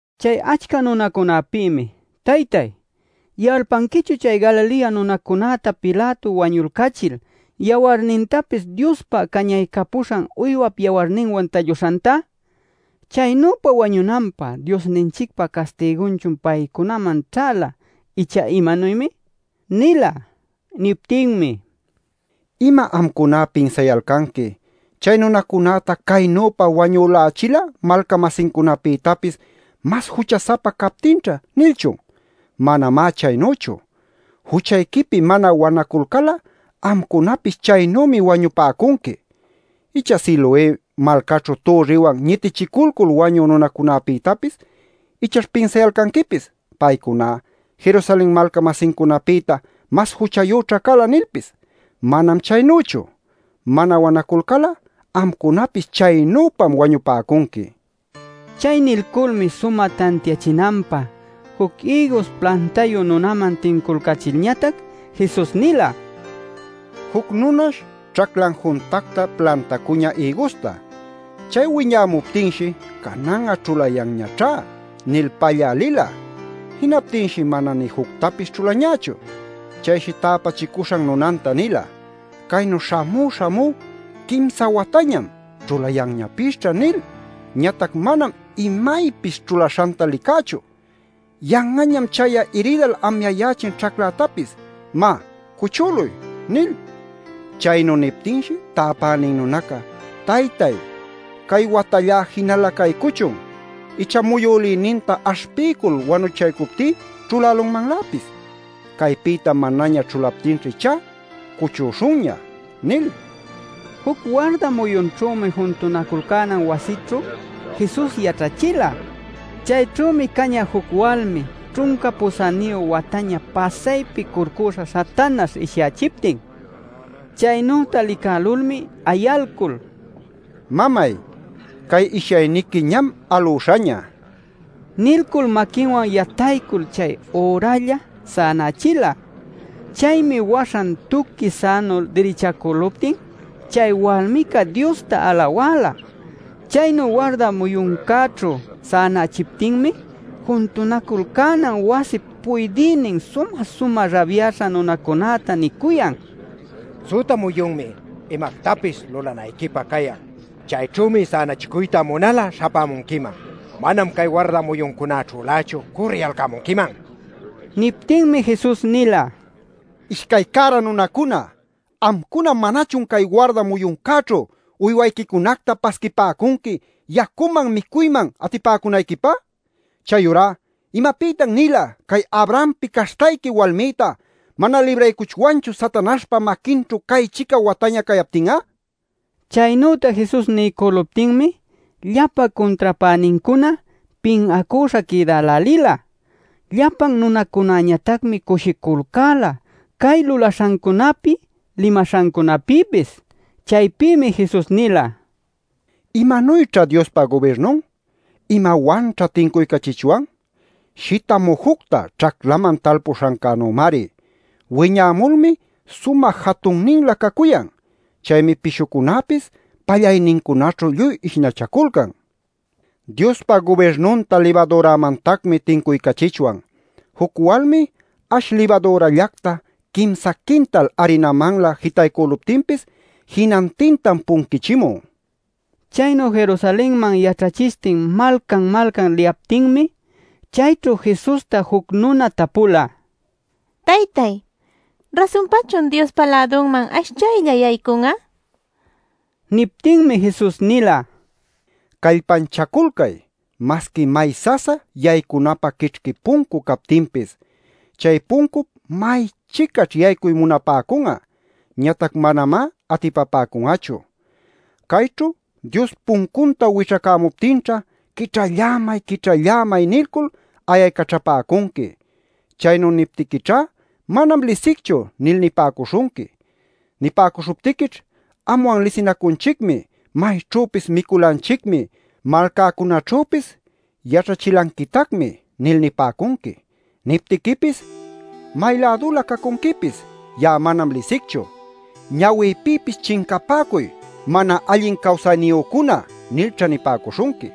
Chay achca nunacunapïmi: “Taytáy ¿yalpanquichun chay Galilea nunacunäta Pilato wañulcachil yawarnintapis Diospa cañaycapuśhan uywap yawarninwan talluśhanta? ¿Chaynüpa wañunanpä Diosninchicpa castigunchun paycunaman ćhäla ichá imanuymi?” nila. Niptinmi: “¿Ima amcuná pinsayalcanqui ‘Chay nunacunäta caynüpa wañülächila malca-masincunapïtapis mas jucha-sapa captinćha’ nilchun? Manamá chaynüchu. Juchayquipi mana wanaculcal'a amcunapis chaynümi wañupäcunqui. Icha Siloé malcaćhu türriwan ñitichiculcul wañü nunacunäpïtapis ichaćh pinsayalcanquipis ‘Paycuná Jerusalen malca-masincunapïta mas juchayüćhá cala’ nilpis. Manam chaynüchu. Mana wanaculcal'a amcunapis chaynüpam wañupäcunqui” nila. Chay nilculmi sumä tantiachinanpä juc ïgus plantayu nunaman tinculcachilñatac Jesus nila: “Juc nunash ćhaclan juntacta plantacuñä ïgusta. Chay wiñäpuptinshi ‘Canan'a ćhulayanñaćhá’ nil pallä lila. Jinaptinshi mana nï juctapis ćhulañächu. Chayshi täpächicuśhan nunanta nila: ‘Caynu śhamú śhamú quimsa watañam “Ćhulayanñapisćha” nil ñatac manam imaypis ćhulaśhanta licächu. Yan'añam chay'a iridal amyayächin ćhaclätapis; má, cuchüluy’ nil. Chaynu niptinshi täpänin nunaca: ‘Taytay, cay watallá jinala caycuchun. Icha muyülïninta aśhpiycul wanuchaycuptí ćhulälunmanläpis. Caypïtá manaña ćhulaptinćha ichá cuchüśhunña’ nil” nila. Juc warda muyunćhümi juntunaculcänan wasićhu Jesus yaćhachila. Chayćhümi cañä juc walmi ćhunca pusäniyu wataña pasaypi curcüśha Satanaśh ishyachiptin. Chaynüta licälulmi ayalcul: “Mamay, cay ishyayniqui ñam alüśhaña” nilcul maquinwan yataycul chay üralla sänachila. Chaymi waśhan tuqui sänu dirichacäluptin chay walmica Diosta alawäla. Chaynu warda muyuncäćhu sänachiptinmi, juntunaculcänan wasip puydïnin sumä-sumä rabyaśha nunacunäta nicuyan: “Süta muyunmi imactapis lulanayquipä cayan. Chayćhümi sänachicuyta munal'a śhapämunquiman, manam cay warda muyuncunaćhülächu cürriyalcämunquiman” nil. Niptinmi Jesus nila: “¡Ishcay cära nunacuna! Amcuna ¿manachun cay warda muyuncäćhu uywayquicunacta pasquipäcunqui yacuman micuyman atipäcunayquipä? Chayurá ¿imapïtan-nila cay Abrahampi caśhtayqui walmïta mana libraycuchwanchu Satanaśhpa maquinćhu cay-chica wataña cayaptin'a?” nil. Chaynüta Jesus niycüluptinmi llapa cuntrapänincuna pin'acüśha quïdälälila. Llapan nunacunäñatacmi cushiculcäla cay lulaśhancunapi limaśhancunapïpis. Chaypïmi Jesus nila: “¿Imanuyćha Diospa gubirnun? ¿Imawanćha tincuycachichwan? Shita mujucta ćhaclaman talpuśhancänümari. Wiñämulmi sumä jatunninlä cacuyan. Chaymi pishucunäpis pallaynincunaćhu lluy ishnachaculcan. “Diospa gubirnunta libadüramantacmi tincuycachichwan. Juc walmi ash libadürallacta quimsa quintal arinamanlä jitaycüluptinpis jinantintam punquichimun” nil. Chaynu Jerusalenman yaćhachishtin malcan-malcan liyaptinmi, chayćhu Jesusta juc nuna tapula: “Taytay, ¿rasunpachun Diospa lädunman ashchaylla yaycun'a?” nil. Niptinmi Jesus nila: “Callpanchaculcay masqui may sasa yaycunapä quićhqui puncu captinpis. Chay puncup may-chicaćh yaycuy munapäcun'a, ñatac manamá atipapäcun'achu. “Chayćhu Dios puncunta wićhacämuptinćha ‘¡Quićhallämay, quićhallämay!’ nilcul ayaycaćhapäcunqui. “Chaynu niptiquićhá ‘Manam lisicchu’ nil nipäcuśhunqui. “Nipäcuśhuptiquićh ‘Anwan lisinacunchicmi, mayćhüpis miculanchicmi, malcäcunaćhüpis yaćhachilanquitacmi’ nil nipäcunqui. “Niptiquipis: ‘¿May-lädulä cacunquipis? Ya'a manam lisicchu. ¡Ñawïpïpis chincapäcuy, mana allin cawsayniyücuna!’ nilćha nipäcuśhunqui.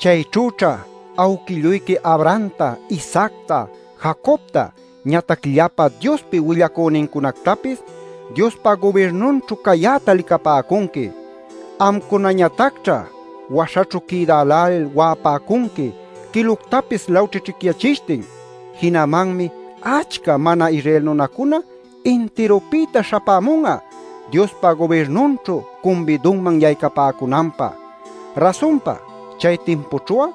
“Chayćhüćha awquilluyqui Abrahamta, Isaacta, Jacobta, ñatac llapa Diospi willacünincunactapis Diospa gubirnunćhu cayäta licapäcunqui. Amcunañatacćha waśhaćhu quïdälälil wa'apäcunqui quiluctapis lawćhićhicyachishtin. Jinamanmi achca mana-Israel nunacuna intirupïta śhapämun'a Diospa gubirnunćhu cumbidunman yaycapäcunanpä. Rasunpa chay timpućhu'a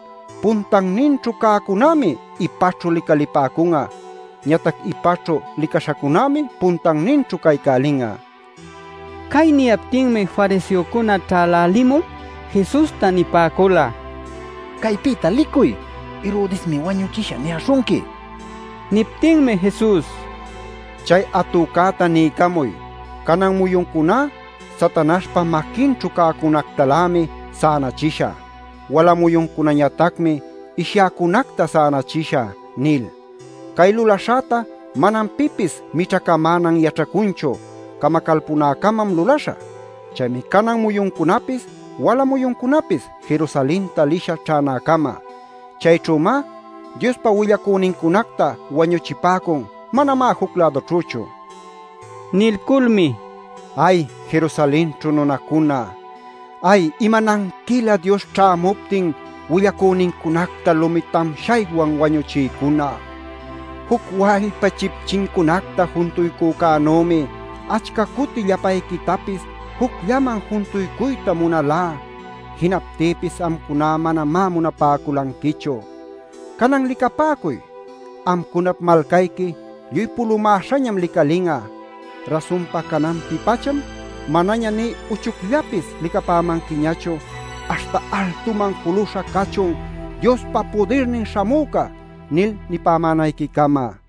puntanninćhu cäcunämi ipaćhu licalipäcun'a; ñatac ipaćhu licaśhacunämi puntanninćhu caycälin'a” nil. Cay niyaptinmi fariseocuna ćhälälimul Jesusta nipäcula: “Caypïta licuy. Herodesmi ‘wañuchishä’ niyäśhunqui” nil. Niptinmi Jesus: “Chay atücäta niycamuy ‘Canan muyuncuná Satanaśhpa maquinćhu cäcunactalämi sänachishä. Wala muyuncunañatacmi ishyäcunacta sänachishä’ nil. Cay lulaśhäta manam pipis mićhacamänan yaćhacunchu. Camacalpunäcamam lulaśhä. Chaymi canan muyuncunapis, wala muyuncunapis, Jerusalenta lishä ćhänäcama. Chayćhümá Diospa willacünincunacta wañuchipäcun; manamá juc-lädućhüchu” nila. Nilculmi: “¡Ay, Jerusalenćhu nunacuna! ¡Ay, imananquilä Dios caćhamuptin willacünincunacta lumi tamshaywan wañuchïcuna! Juc wallpa chipchincunacta juntuycücänümi achca cuti llapayquitapis jucllaman juntuycuyta munalá. Jinaptïpis amcuna manamá munapäculanquichu. Canan licapäcuy; amcunap malcayqui lluy pulumäśhañam licalin'a. Rasunpa cananpi-pacham manaña nï uchucllapis licapämanquiñachu aśhta ‘¡Altuman juluśha cachun Diospa Pudirnin Śhamüca!’ nil nipämänayquicama” nila.